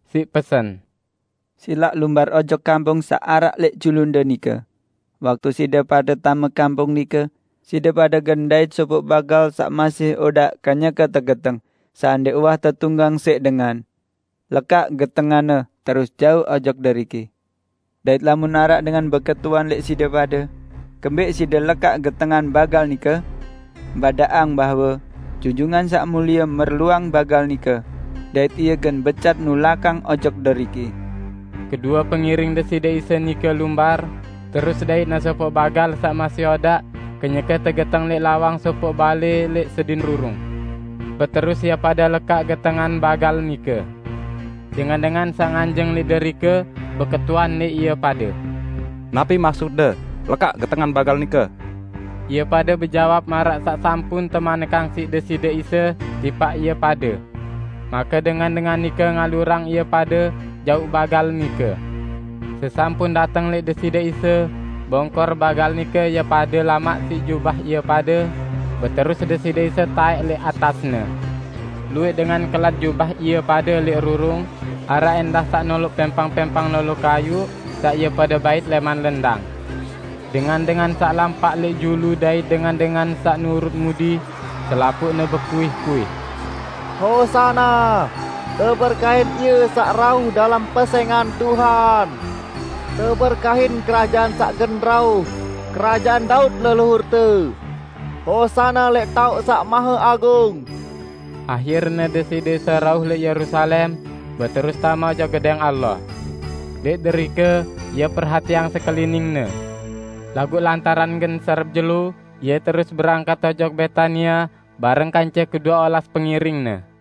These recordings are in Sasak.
siq pesen: "Silaq lumbar ojok kampung saq araq lẽq julunde nike. Waktu side pade tame kampung nike, side pade gen ndait sopoq bagal saq masih odaq kenyeke tegeteng, saq ndẽq uwah tetunggang siq dengan. Lekaq getenganne terus jauq ojok deriki." Dait lamun araq dengan beketuan lẽq side pade, "Kembẽq side lekaq getengan bagal nike?" Badaqang bahwe, "Junjungan Saq Mulie merluang bagal nike dait Ie gen becat nulakang ojok deriki." Kedue pengiring Deside Isa nike lumbar, terus daitne sopoq bagal saq masih odaq kenyeke tegeteng lẽq lawang sopoq balẽ lẽq sedin rurung. Beterus ie pade lekaq getengan bagal nike. Dengan-dengan saq nganjeng lẽq derike beketuan lẽq ie pade, "Napi maksutde lekaq getengan bagal nike?" Ie pade bejawab maraq saq sampun temanikang siq Deside Isa tipaq ie pade. Make dengan-dengan nike ngalurang ie pade jauq bagal nike. Sesampun dateng lẽq Deside Isa, bongkor bagal nike ie pade lamak siq jubah ie pade, beterus Deside Isa taẽk lẽq atasne. Luwẽq dengan kelat jubah ie pade lẽq rurung, araq ẽndah saq noloq pẽmpang-pẽmpang lolo kayuq saq ie pade bait lẽman lendang. Dengan-dengan saq lampaq lẽq julu dait dengan-dengan saq nurut mudi, selapuqne bekuih-kuih, "Hosana! Teberkahin Ie saq rauh dalem pesẽngan Tuhan! Teberkahin kerajaan saq gen rauh -- Kerajaan Daud leluhurte! Hosana lẽq taoq saq maheagung!" Ahirne Deside Isa rauh lẽq Yerusalem, beterus tame ojok Gedẽng Allah. Lẽq derike Ie perhatiang sekelining-Ne. Laguq lantaran gen serep jelo, Ie terus berangkat ojok Betania bareng kance kedue olas pengiring-Ne.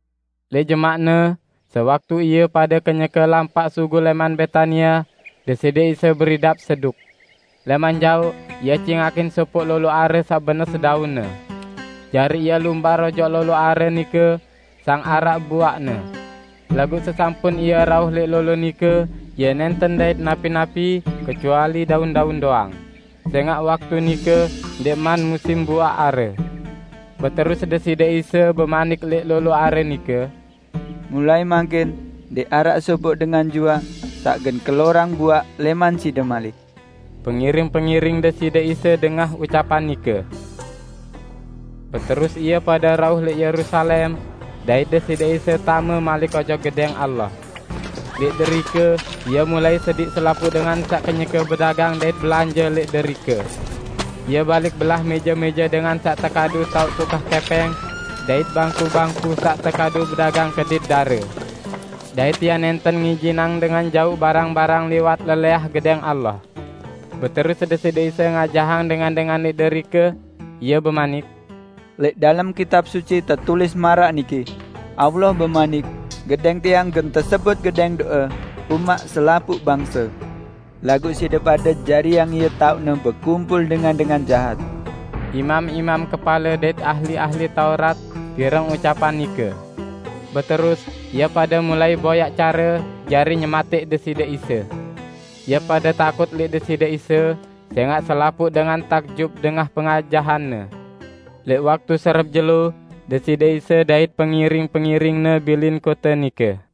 Lẽq jemaqne, sewaktu ie pade kenyeke lampaq sugul lẽman Betania, Deside Isa beridap seduk. Lẽman jaoq Ie cingakin sopoq lolo are saq benes daunne. Jari Ie lumbar ojok lolo are nike sang araq buaqne. Laguq sesampun Ie rauh lẽq lolo nike, Ie nẽnten ndait napi-napi, kecuali daun-daun doang, sẽngaq waktu nike ndẽqman musim buaq are. Beterus Deside Isa bemanik lẽq lolo are nike, "Mulai mangkin ndẽq araq sopoq dengan juaq saq gen kelorang buaq lẽman side malik!" Pengiring-pengiring Deside Isa dengah ucapan nike. Beterus ie pade rauh lẽq Yerusalem, dait Deside Isa tame malik ojok Gedẽng Allah. Lẽq derike Ie mulai sediq selapuq dengan saq kenyeke bedagang dait belanje lẽq derike. Ie balik belah mẽje-mẽje dengan saq tekadu taoq tukah kẽpẽng, dait bangku-bangku saq tekadu bedagang kedit dare. Dait Ie nẽnten ngijinang dengan jauq barang-barang liwat lelẽah Gedẽng Allah. Beterus Deside Isa ngajahang dengan-dengan lẽq derike. Ie bemanik, "Lẽq dalem Kitab Suci tetulis maraq niki: Allah bemanik, 'Gedẽng Tiang gen tesebut gedẽng do'e umaq selapuq bangse.' Laguq side pade jariang ie taoqne bekumpul dengan-dengan jahat!" Imam-imam kepale dait ahli-ahli Taurat pireng ucapan nike. Beterus ie pade mulai boyaq care jari nyematẽq Deside Isa. Ie pade takut lẽq Deside Isa, sẽngaq selapuq dengan takjub dengah pengajahan-Ne. Lẽq waktu serep jelo, Deside Isa dait pengiring-pengiring-Ne bilin kote nike.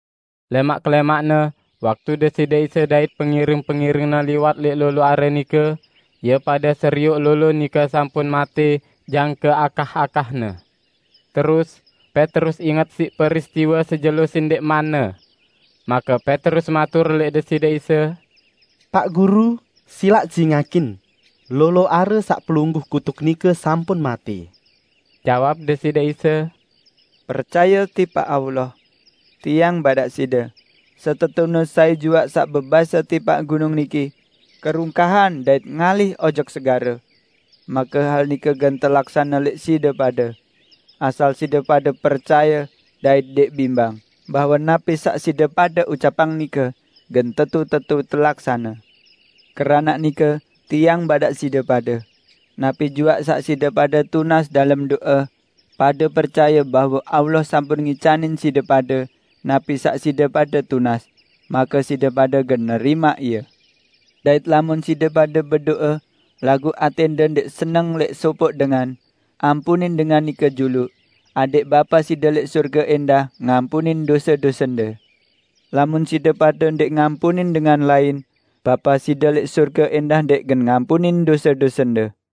Lẽmaq kelẽmaqne, waktu Deside Isa dait pengiring-pengiring-Ne liwat lẽq lolo are nike, ie pade serioq lolo nike sampun matẽ jangke akah-akahne. Terus Petrus inget siq peristiwe sejelo sendẽqmanne. Make Petrus matur lẽq Deside Isa, "Paq Guru, silaq cingakin! Lolo are saq Pelungguh kutuk nike sampun matẽ!" Jawab Deside Isa, "Percaye tipaq Allah. Tiang badaq side pade: Setetune sai juaq saq bebase tipaq gunung niki, 'Kerungkahan dait ngalih ojok segare!' make hal nike gen telaksane lẽq side pade; asal side pade percaye dait ndẽq bimbang, bahwe napi saq side pade ucapang nike gen tetu-tetu telaksane. Keranaq nike Tiang badaq side pade: Napi juaq saq side pade tunas dalem do'e, pade percaye bahwe Allah sampun ngicanin side pade napi saq side pade tunas, make side pade gen nerimaq ie. Dait lamun side pade bedo'e, laguq atẽnde ndẽq seneng lẽq sopoq dengan, ampunin dengan nike juluq, adẽq Bapa side lẽq sorge ẽndah ngampunin dose-dosende. [ Lamun side pade ndẽq ngampunin dengan lain, Bapa side lẽq sorge ẽndah ndẽq gen ngampunin dose-dosende.]"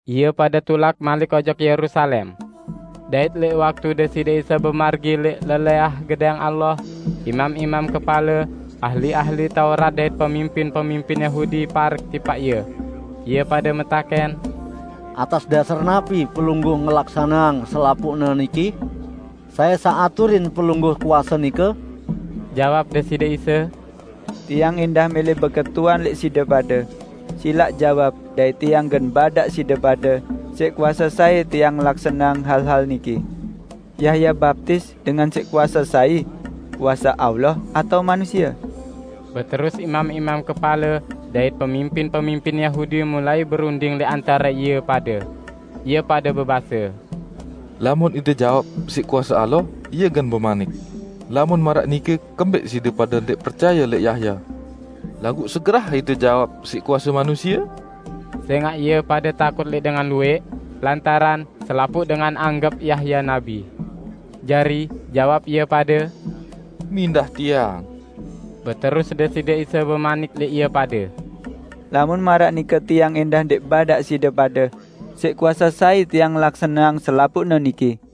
Ie pade tulak malik ojok Yerusalem. Dait lẽq waktu Deside Isa bemargi lẽq lelẽah Gedẽng Allah, imam-imam kepale, ahli-ahli Taurat dait pemimpin-pemimpin Yahudi parek tipaq Ie. Ie pade metakẽn, "Atas dasar napi Pelungguh ngelaksaneang selapuqne niki? Sai saq aturin Pelungguh kuase nike?" Jawab Deside Isa, "Tiang ẽndah mẽlẽ beketuan lẽq side pade. Silaq jawab dait Tiang gen badaq side pade siq kuase sai Tiang ngelaksaneang hal-hal niki. Yahya baptis dengan siq kuase sai? Kuase Allah atao manusie?" Beterus imam-imam kepale dait pemimpin-pemimpin Yahudi mulai berunding lẽq antare ie pade. Ie pade bebase, "Lamun ite jawab, 'Siq kuase Allah,' Ie gen bemanik, 'Lamun maraq nike kembẽq side pade ndẽq percaye lẽq Yahya?' Laguq segerah ite jawab, 'Siq kuase manusie.' " Sẽngaq ie pade takut lẽq dengan luwẽq, lantaran selapuq dengan anggep Yahya nabi. Jari, jawab ie pade, "Mindah tiang." Beterus Deside Isa bemanik lẽq ie pade, "Lamun maraq nike Tiang ẽndah ndẽq badaq side pade siq kuase sai Tiang ngelaksaneang selapuqne niki."